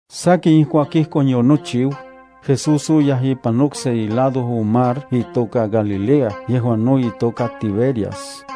Sakin ijkuak ijkon yonochiu, Jesús oyaj ipan okse ilado on mar itoka Galilea yejuan no itoka Tiberias.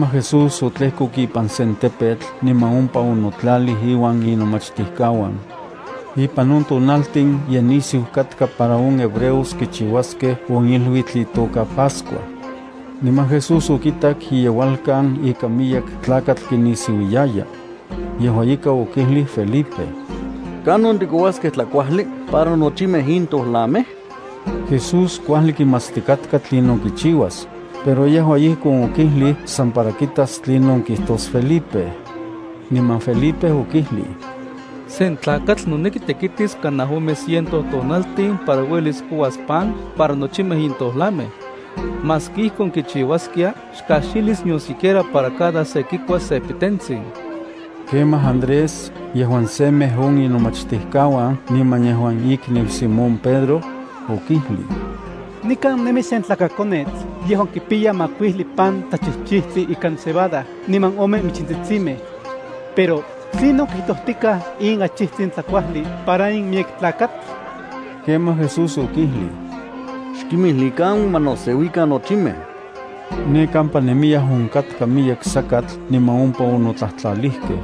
Kemaj Jesús otlejkok ipan sen tepetl niman ompa onotlalij iuan inomachtijkauan. Ipan on tonaltin ye nisiu katka para on hebreos kichiuaskej on iluitl itoka Pascua. Niman Jesús okitak iyeualkan ika miyek tlakatl kinisiuiyaya. Yejua ika okijlij Felipe: —¿Kanon tikouaskej tlakuajli para nochimej in tojlamej? Jesús kuajli kimatstikatka tlinon kichiuas, pero yejua ijkon okijlij san para kitas tlinon kijtos Felipe. Niman Felipe okijlij: —Se tlakatl noneki tekitis kanaj ome ciento tonaltin para uelis kouas pan para nochimej in tojlamej. Maski Ijkon kichiuaskia xkajxilis nion siquiera para cada se kikuas se pitentsin. Kemaj Andrés, yejuan semej on inomachtijkauan niman yejuan ikniu Simón Pedro, okijlij: —Nikan nemi sen tlakakonetl yejuan kipiya makuijli pan tlachijchitli ikan cebada niman ome michintsitsimej. Pero ¿tlinon kijtojtikaj in achijtsin tlakuajli para in miyek tlakatl? Kemaj Jesús okijlij: —Xkimijlikan ma noseuikan nochimej. Ne kampa nemiyaj onkatka miyek sakatl niman ompa onotlajtlalijkej.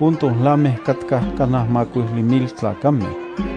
On tolamej katkaj kanaj makuijli mil tlakamej.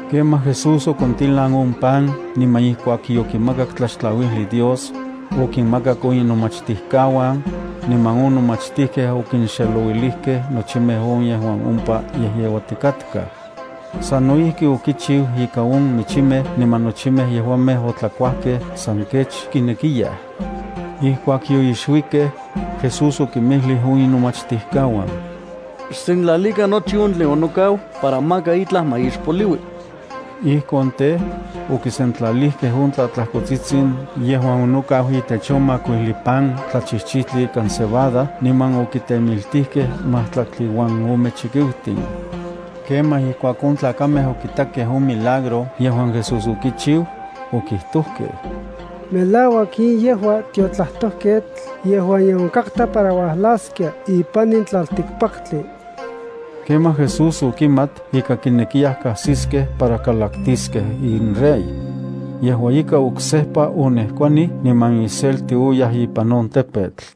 Kemaj Jesús okontilan on pan niman, ijkuak yokimakak tlaxtlauijli Dios, okinmakak on inomachtijkauan, niman on nomachtijkej okinxelouilijkej nochimej on yejuan ompa yejyeuatikatkaj. Sano ijki okichiu ika on michimej niman nochimej yejuamej otlakuajkej san kech kinekiyaj. Ijkuak yoixuikej, Jesús okinmijlij on inomachtijkauan: —Xsentlalikan nochi on tlen onokau para maka itlaj ma ixpoliui. Ijkon tej, okisentlalijkej on tlatlajkotsitsin yejuan onokau itech on makuijli pan tlachijchijtli ikan cebada niman okitemiltijkej majtlaktli uan ome chikiutin. Kemaj ijkuak on tlakamej okitakej on milagro yejuan Jesús okichiu, okijtojkej: —Melauak in yejua tiotlajtojketl yejuan ye onkatka para uajlaskia ipan in tlaltikpaktli. Kemaj Jesús okimat ika kinekiyaj kasiskej para kalaktiskej inrey. Yejua ika, oksejpa onejkuanij niman iselti oyaj ipan on tepetl.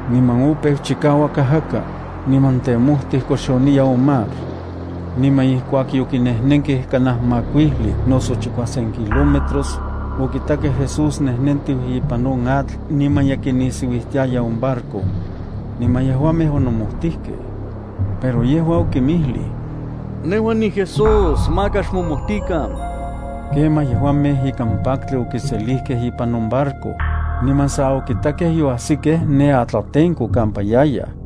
Niman opeu chikauak ajaka, niman tejmotij koxoniya on mar. Niman ijkuak yokinejnenkej kanaj makuijli noso chikuasen kilómetros, okitakej Jesús nejnentiu ipan on atl niman ye kinisiuijtiaya on barco. Niman yejuamej onomojtijkej. Pero yejua okinmijlij: —¡Nejua niJesús, maka xmomojtikan! Kemaj, yejuamej ikan paktli okiselijkej ipan on barco, niman sa okitakej yoajsikej ne atlatenko kampa yayaj.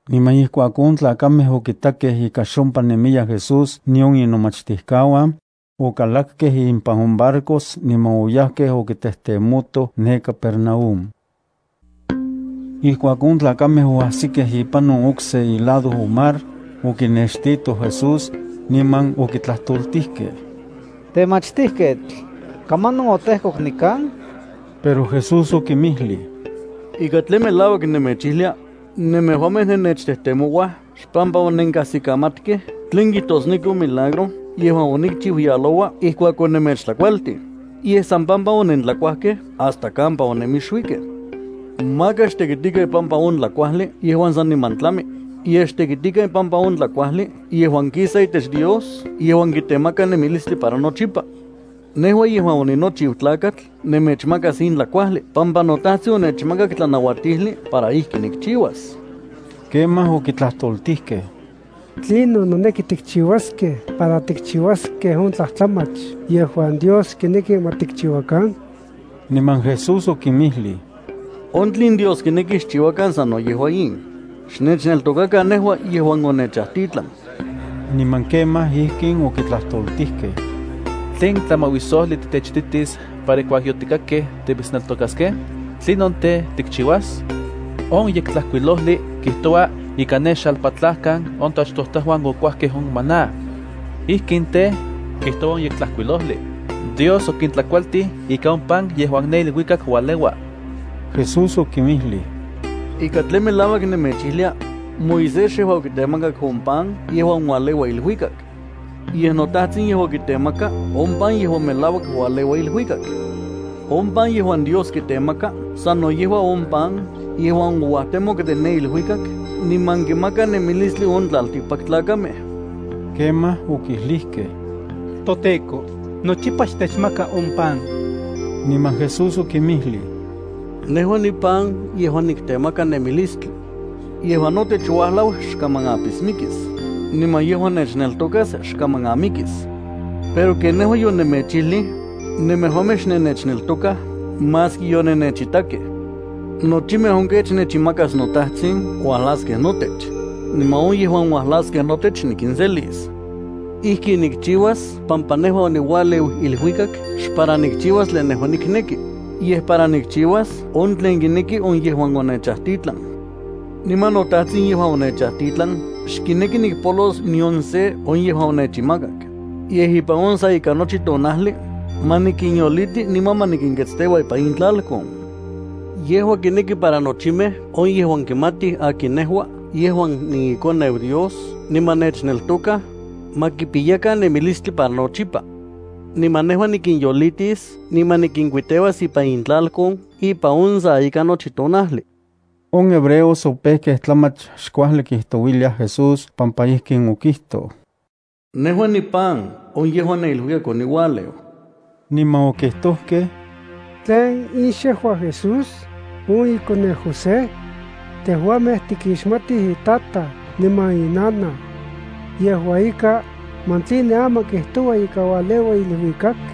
Niman ijkuak on tlakamej okitakej ika xompa nemiya Jesús nion inomachtijkauan, okalakkej impan on barcos niman oyajkej okitejtemotoj ne Capernaúm. Ijkuak on tlakamej oajsikej ipan on okse ilado on mar, okinextitoj Jesús, niman okitlajtoltijkej: —Temachtijketl, ¿kamanon otejkok nikan? Pero Jesús okinmijlij: —Ika tlen melauak nemechijlia nemejuamej nennechtejtemouaj xpampa onenkajsikamatkej tlen kijtosneki on milagro yejuan onikchiu yaloua ijkuak onemechtlakualtij, yej san pampa onentlakuajkej hasta kampa onemixuikej. Maka xtekitikan ipampa on tlakuajli yejuan saniman tlami, yej xtekitikan ipampa on tlakuajli yejuan kisa itech Dios yejuan kitemaka nemilistli para nochipa. Nejua yejuan oninochiu Tlakatl nemechmakas in tlakuajli pampa noTajtsin onechmakak tlanauatijli para ijkin nikchiuas. Kemaj okitlajtoltijkej: —¿Tlinon noneki tikchiuaskej para tikchiuaskej on tlajtlamach yejuan Dios kineki ma tikchiuakan? Niman Jesús okinmijlij: —On tlen Dios kineki xchiuakan sano yejua in: Xnechneltokakan nejua yejuan onechajtitlan. Niman kemaj ijkin okitlajtoltijkej: —¿Tlen tlamauisojli titechititis para ijkuak yotikitakej timitsneltokaskej? ¿Tlinon tej, tikchiuas? On Yektlajkuilojli kijtoua ika ne xalpatlajkan on toachtojtajuan okuajkej on maná. Ijkin tej, kijtoua on Yektlajkuilojli: “Dios okintlakualtij ika on pan yejuan ne iluikak ualeua.” Jesús okinmijlij: —Ika tlen melauak nemechijlia: Moisés xejua okitemakak on pan yejuan ualeua iluikak. Yej noTajtsin yejua kitemaka on pan yejuan melauak ualeua iluikak. On pan yejuan Dios kitemaka sano yejua on pan yejuan ouajtemok de ne iluikak niman kinmaka nemilistli on tlaltikpaktlakamej. Kemaj okijlijkej: —ToTEKO, nochipa xtechmaka on pan. Niman Jesús okinmijlij: —Nejua nipan yejuan kitemaka nemilistli. Yejuan notech uajlau xkaman apismikis, niman yejuan nechneltokas xkaman amikis. Pero ken nejua yonemechijlij, nemejuamej xnennechneltokaj maski yonennechitakej. Nochimej on kech nechinmakas noTajtsin uajlaskej notech, niman on yejuan uajlaskej notech nikinselis. Ijkin nikchiuas pampa nejua oniualeu iluikak xpara nikchiuas tlen nejua nikneki, yej para nikchiuas on tlen kineki on yejuan onechajtitlan. Niman noTajtsin yejuan onechajtitlan xkineki nikpolos nion se on yejuan onechinmakak, yej ipan on sa ika nochi tonajli ma nikinyoliti niman ma nikinketsteua ipan intlalkon. Yejua kineki para nochimej on yejuan kimatij akin nejua yejuan niiKoneu Dios niman nechneltokaj, ma kipiyakan nemilistli para nochipa. Niman nejua nikinyolitis niman nikinkuiteuas ipan intlalkon ipan on sa ika nochi tonajli. On hebreos opejkej tlamach xkuajli kijtouiliaj Jesús pampa ijkin okijtoj: “Nejua nipan on yejuan ne iluikak oniualeu.” Niman okijtojkej: —¿Tlen in xejua Jesús, on ikoneu José? Tejuamej tikixmatij itataj niman inanaj. Yejua ika, ¿man tline aman kijtoua ika ualeua iluikak?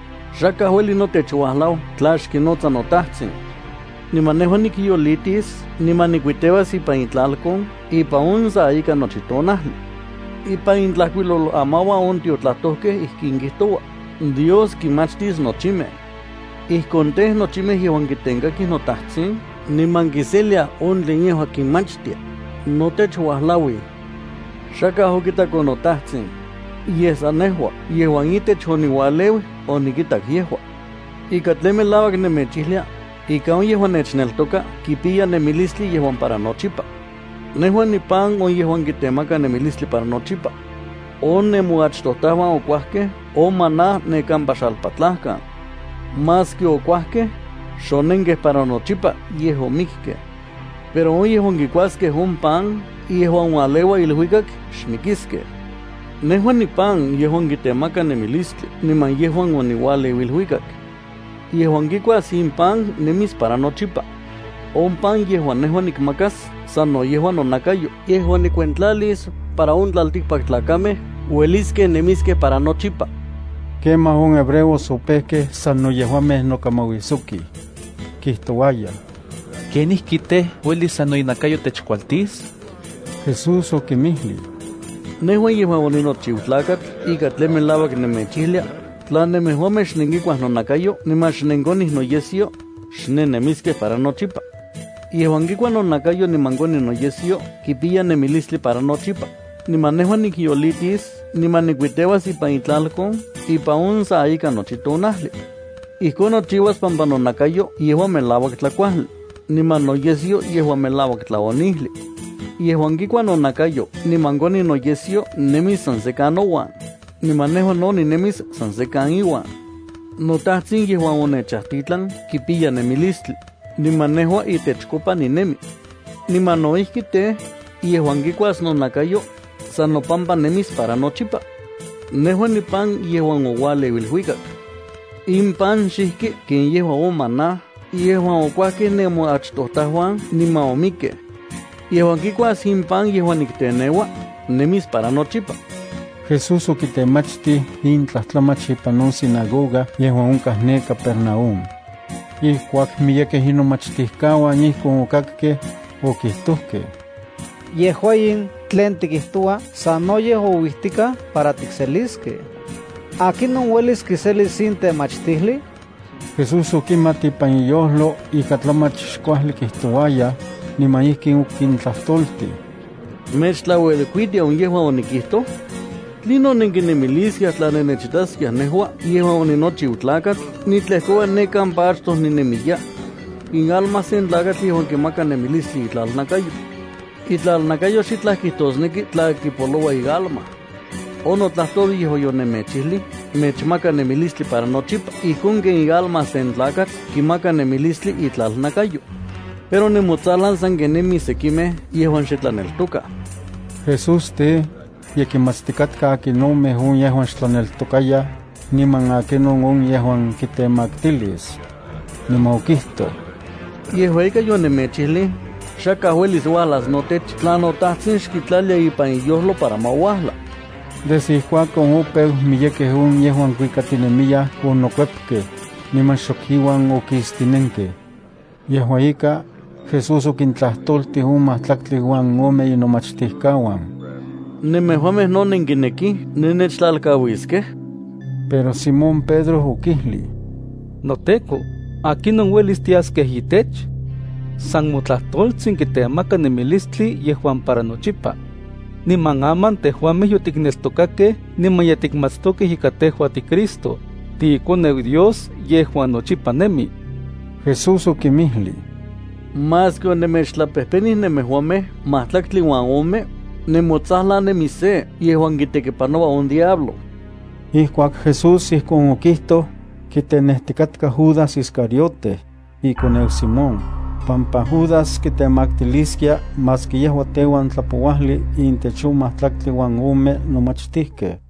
Xakaj ueli notech uajlau tla xkinotsa noTajtsin. Niman nejua nikyolitis niman nikuiteuas ipan itlalkon ipan on sa ika nochi tonajli. Ipan intlajkuilolamauan on tiotlajtojkej ijkin kijtoua: “Dios kinmachtis nochimej.” Ijkon tej, nochimej yejuan kitenkakij toTajtsin niman kiseliaj on tlen yejua kinmachtia, notech uajlauij. Xakaj okitak on noTajtsin, yej san nejua yejuan itech oniualeu onikitak yejua. Ika tlen melauak nemechijlia, ika on yejuan nechneltoka kipiya nemilistli yejuan para nochipa. Nejua nipan on yejuan kitemaka nemilistli para nochipa. On nemoachtojtajuan okuajkej on maná ne kampa xalpatlajkan. Maski okuajkej, xonenkej para nochipa, yej omikkej. Pero on yejuan kikuaskej on pan yejuan ualeua iluikak xmikiskej. Nejua nipan yejuan kitemaka nemilistli niman yejuan oniualeu iluikak. Yejuan kikuas in pan nemis para nochipa. On pan yejuan nejua nikmakas sano yejua nonakayo yejuan nikuentlalis para on tlaltikpaktlakamej ueliskej nemiskej para nochipa. Kemaj on hebreos opejkej sano yejuamej nokamauisojkij. Kijtouayaj: —¿Kenijki tej, uelis sano inakayo techkualtis? Jesús okinmijlij: —Nejua yejuan onochiu Tlakatl ika tlen melauak nemechijlia, tla nemejuamej xnenkikuaj nonakayo niman xnenkonij noyesyo, xnennemiskej para nochipa. Yejuan kikua nonakayo niman koni noyesyo kipiya nemilistli para nochipa, niman nejua nikyolitis niman nikuiteuas ipan itlalkon ipan on sa ika nochi tonajli. Ijkon nochiuas pampa nonakayo yejua melauak tlakuajli, niman noyesyo yejua melauak tlaonijli. Yejuan kikua nonakayo niman koni noyesyo nemis san sekan nouan, niman nejua no ninemis san sekan iuan. NoTajtsin yejuan onechajtitlan kipiya nemilistli, niman nejua itechkopa ninemi. Niman no ijki tej, yejuan kikuas nonakayo, san nopampa nemis para nochipa. Nejua nipan yejuan oualeu iluikak. In pan xijki ken yejua on maná yejuan okuajkej nemoachtojtajuan niman omikkej. Yejuan kikuas in pan yejuan nikteneua, nemis para nochipa. Jesús okitemachtij in tlajtlamach ipan on sinagoga yejuan onkaj ne Capernaúm. Ijkuak miyekej inomachtijkauan ijkon okakkej, okijtojkej: —Yejua in tlen tikijtoua sanoyej ouijtikaj para tikseliskej. ¿Akinon uelis kiselis in temachtijli? Jesús okimat ipan iyojlo ika tlamach xkuajli kijtouayaj, niman ijkin okintlajtoltij: —¿Mechtlauelkuitia on yejuan onikijto? ¿Tlinon nenkinemiliskiaj tla nennechitaskiaj nejua yejuan oninochiu Tlakatl nitlejkoua ne kampa achtoj ninemiya? Ialma sen tlakatl yejua kimaka nemilistli itlalnakayo. Itlalnakayo xitlaj kijtosneki tla kipoloua ialma. On notlajtol yejuan yonemechijlij mechmaka nemilistli para nochipa ijkon ken ialma sen tlakatl kimaka nemilistli itlalnakayo. Pero nemotsajlan sanken nemij sekimej yejuan xe tlaneltokaj. Jesús tej, ye kimatstikatka akinomej on yejuan xtlaneltokayaj, niman akinon on yejuan kitemaktilis. Niman okijtoj: —Yejua ika, yejua ika yonemechijlij xakaj uelis notech uajlas, tla noTajtsin xkitlalia ipan iyojlo para ma uajla. Desde ijkuakon opeu miyekej on yejuan kuikatinemiyaj onokuepkej, niman xok iuan okistinenkej. Yejua ika, Jesús okintlajtoltij on majtlaktli uan ome inomachtijkauan: —¿Nemejuamej no nenkinekij nennechtlalkauiskej? Pero Simón Pedro okijlij: —NoTEKO, ¿akinon uelis tiaskej itech? San motlajtoltsin yejuan tikijtoua yejua kitemaka nemilistli yejuan para nochipa. Niman aman tejuamej yotikneltokakej niman ye tikmatstokej ika tejua tiCristo, tiiKoneu Dios yejuan nochipa nemi. Jesús okinmijlij: —Maski onemechtlapejpenij nemejuamej majtlaktli uan ome, nemotsajlan nemi se yejuan kitekipanoua on diablo. Ijkuak Jesús ijkon okijtoj, kitenejtikatka Judas Iscariote, ikoneu Simón, pampa Judas kitemaktiliskia maski yejua teuan tlapouajli intech on majtlaktli uan ome nomachtijkej.